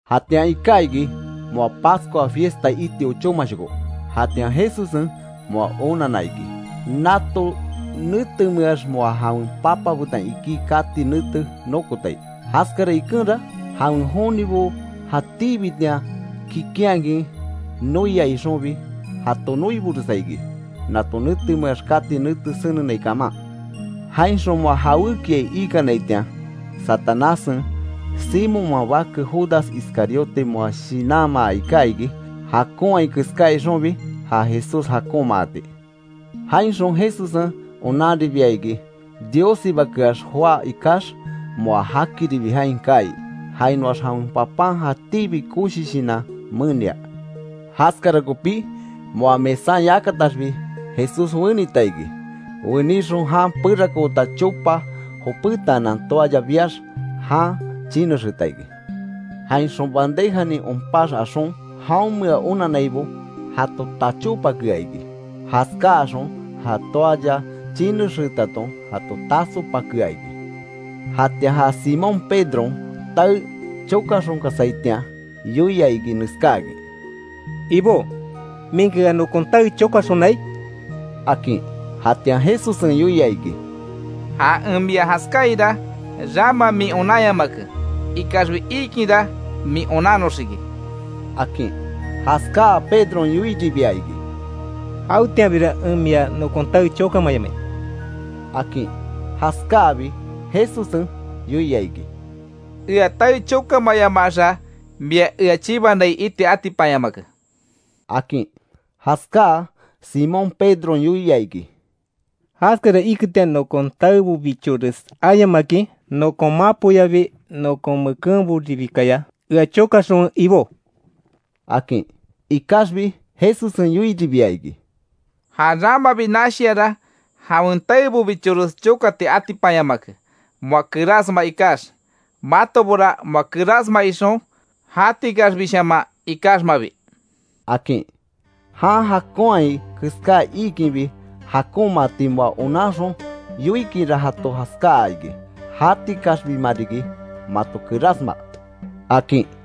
Jatian iká iki, moa Pascua fiesta iti ochómashoko. Jatian Jesussen moa onanna iki, nato netemeax moa jawen Papa betan ikí kati nete nokotai. Jaskara ikenra, jawen jonibo jatíbitian kikinhakin noia ixonbi, jato noiboresa iki, nato netemeax kati nete senenai kaman. Jainxon moa jawékiai ikanaitian, Satanássen, Simonman bake Judas Iscariote moa shinanmaa iká iki, jakonhai keská ixonbi ja Jesús jakonmaati. Jainxon Jesussen onanribia iki, Diossibakeax joá ikax moa jakiribi jain kaai. Jainoax jawen Papan jatíbi koshi shinan menia. Jaskara kopí moa mesan yakataxbi Jesús wenita iki, wenixon jan perakoota chopa jopétaanan toalla biax, jan chinexeeta iki. Jainxon bandejanin onpax axon, jaonmea onannaibo jato tachopakea iki, jaskáaxon ja toalla chinexeetaton jato tasopakea iki. Jatian ja Simón Pedron, tae chokaxonkasaitian, yoia iki neskáakin: —Ibó ¿Minki ea nokon tae chokaxonai? —akin. Jatian Jesussen yoia iki: —Ja en mia jaskáaira, rama min onanyamake. Ikaxbi iikinra min onannoxiki —akin. Jaskáa Pedron yoiribia iki: —¡Jawetianbira en mia nokon tae chokamayamai! —akin. Jaskáabi Jesussen yoia iki: —Ea tae chokamayamaxa, mia ea chibanai iti atipanyamake —akin. Jaskáa Simón Pedron yoia iki: —¡Jaskara iketian, nokon taebobichores ayamakin, nokon mapoyabi nokon mekenboribikaya, ea chokaxonwe Ibó! —akin. Ikaxbi Jesussen yoiribia iki: —Ja ramabi nashiara, jawen taebobichores chokati atipanyamake moa kerásma ikax. Matobora moa kerásma ixon, jatikaxbishaman ikaxmabi —akin. Jan jakonhai keská iikinbi jakonmaati moa onanxon yoikinra jato jaskáa iki: “Jatikaxbimariki mato kerasma”, akin.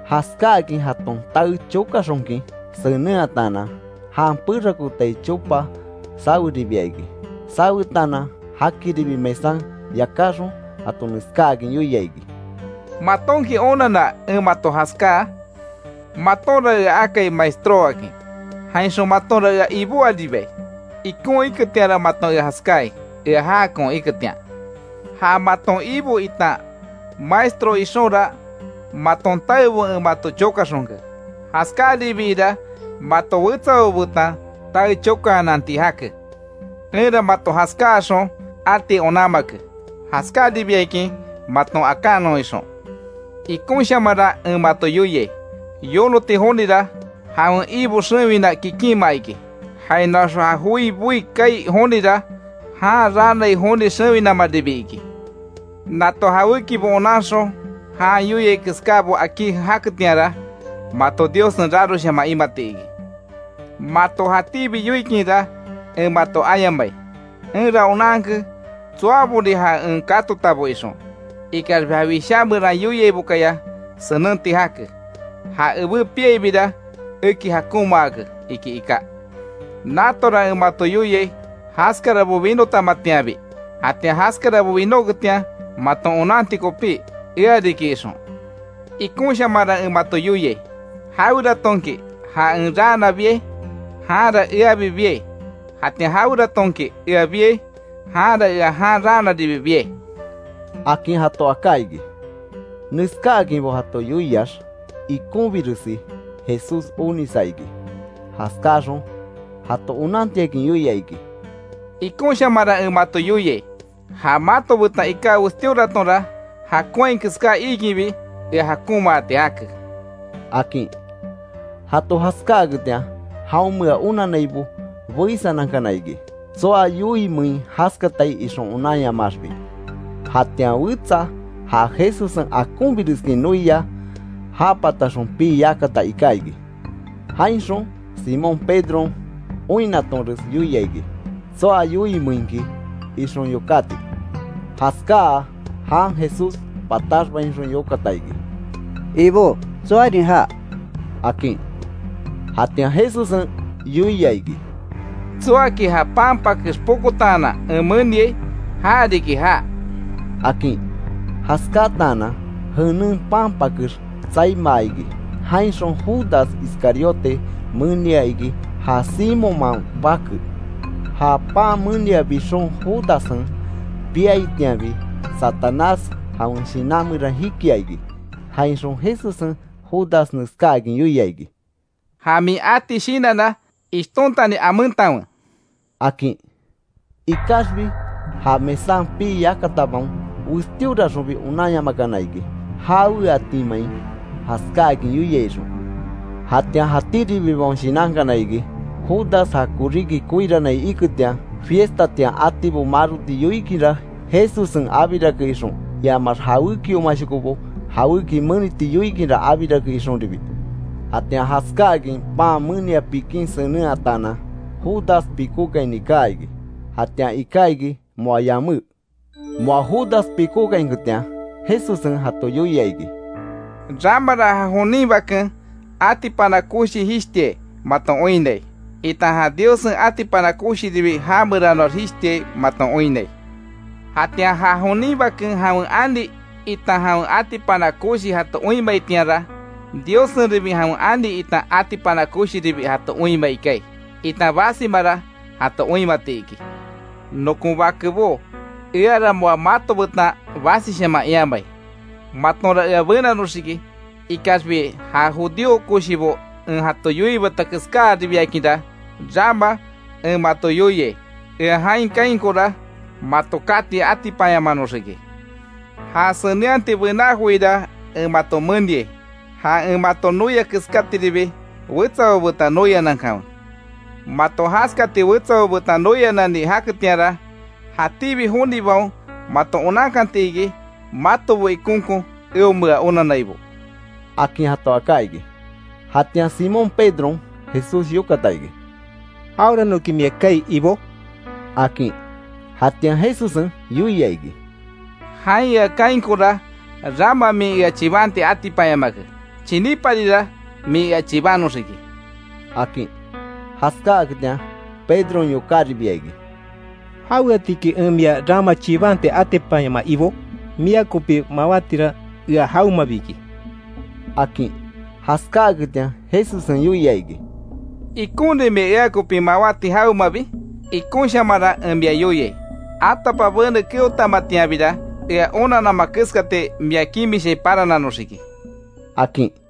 Jaskáakin jaton tae chokaxonkin senenhataanan, jan perakootai chopa saweribia iki. Sawetaanan jakiribi mesan yakáxon jato neskáakin yoia iki: —¿Matonki onanna, en mato jaskáa? Matonra ea akai Maestró akin, jainxon, matonra ea Ibó aríbai. Ikon iketianra maton ea jaskáai ea jákon iketian. Ja maton Ibo itan Maestro ixonra, maton taebo en mato chokaxonke, jaskáribiira mato wetsabo betan tae chokaananti jake. Enra mato jaskáaxon ati onanmake, jaskáaribiakin maton akanon ixon. Ikonshamanra en mato yoiai, yonoti jonira, jawen ibo xewina kikinma iki. Jainoax ja joi boí kaai jonira, jan raanai joni xewinamaribi iki. Nato jawékibo onanxon jan yoiai keskábo akí jaketianra, mato Diossen raroshaman imati iki. Mato jatíbi yoikinra, en mato ayamai. Enra onanke, tsoaborin ja en katotabo ixon, ikaxbi ja Wishá meran yoiaibokaya senenti jake: ‘Ja ebé piaibira eki jakonmaake’, iki iká. Natora en mato yoiai jaskarabo winotamatianbi, jatian jaskarabo winóketian maton onanti kopí, ea riki ixon. Ikonshamanra en mato yoiai: Jaweratonki ja en raana biai, janra eabi biai, jatian jaweratonki ea biai, janra ea jan raanaribi biai —akin jato aká iki. Neskáakinbo jato yoiax, ikonbiresi Jesús onisa iki. Jaskáxon, jato onantiakin yoia iki: —Ikonshamanra en mato yoiai, ja mato betan iká westíoratonra, jakonhai keská iikinbi ea jakonmaati jake —akin. Jato jaskáaketian, jaonmea onannaibo beísanankana iki, tsoa yoiimein jaskatai ixon onanyamaaxbi. Jatian wetsa ja Jesussen akonbireskin noia, ja pataxon pii yakata iká iki. Jainxon Simón Pedron oinnatonres yoia iki, tsoa yoiimeinki ixon yokáti. Jaskáa, jan Jesús pataxbainxon yokata iki: —¿Ibó, tsoarin já? —akin. Jatian Jesussen yoia iki: —Tsoaki ja pan pakex pokotaanan en meniai, ja riki já —akin. Jaskataanan jenen pan pakex tsaimaa iki jainxon Judas Iscariote menia iki ja Simonman bake. Ja pan menia bixon, Judassen piaitianbi, Satanás jawen shinan meran jikia iki, jainxon Jesussen Judas neskáakin yoia iki: —Ja min ati shinanna ishtontani amentanwe —akin. Ikaxbi ja mesan pii yakatabaon westíoraxonbi onanyamakana iki, jaweatimein jaskáakin yoiai ixon. Jatian jatíribibaon shinankana iki, Judas ja koríki koirannai iketian, fiestatian atibo maroti yoikinra, Jesussen abirake ixon, iamax jawékiomashokobo jawéki meniti yoikinra, abirake ixonribi. Jatian jaskáakin pan menia pikin senenhataanan Judas pikókaini kaa iki. Jatian iká iki moa yamé. Moa Judas pikókainketian, Jesussen jato yoia iki: —Ramara ja jonin Baken atipana koshi jishtiai maton oinnai, itan ja Diossen atipana koshiribi jameranoax jishtiai maton oinnai. Jatian ja jonin Baken jawen ani, itan jawen atipana koshi jato oinmaitianra, Diossenribi jawen ani itan atipana koshiribi jato oinmai kaai, itan basimara jato oinmati iki. Nokon bakebó, eara moa mato betan basishaman iamai, matonra ea benanoxiki. Ikaxbi ja judío koshibo en jato yoiibata keskáribiakinra, rama en mato yoiai, ea jain kaainkora mato kati atipanyamanoxiki. Ja senenhati bená joira en mato meniai: Ja en mato noia keskatiribi, wetsabo betan noianankanwe. Mato jaskati wetsabo betan noianani jaketianra, jatíbi jonibaon mato onankanti iki, matobo ikonkon eonmea onannaibo —akin jato aká iki. Jatian Simón Pedron Jesús yokata iki: —¿Jaweranoki mia kaai Ibó? —akin. Jatian Jesussen yoia iki: —Jain ea kaainkora rama min ea chibanti atipanyamake, chiníparira min ea chibanoxiki —akin. Jaskáaketian Pedron yokáribia iki: —¿Jaweatiki en mia rama chibanti atipanyamaa, Ibó? ¡Mia kopi mawátira ea jawemabi iki! —akin. Jaskáaketian Jesussen yoia iki: —¿Ikonrin mia ea kopi mawáti jawemabi? Ikonshamanra en mia yoiai: Atapabene keotamatianbira, ea onanama keskati mia kimishai parananoxiki —akin.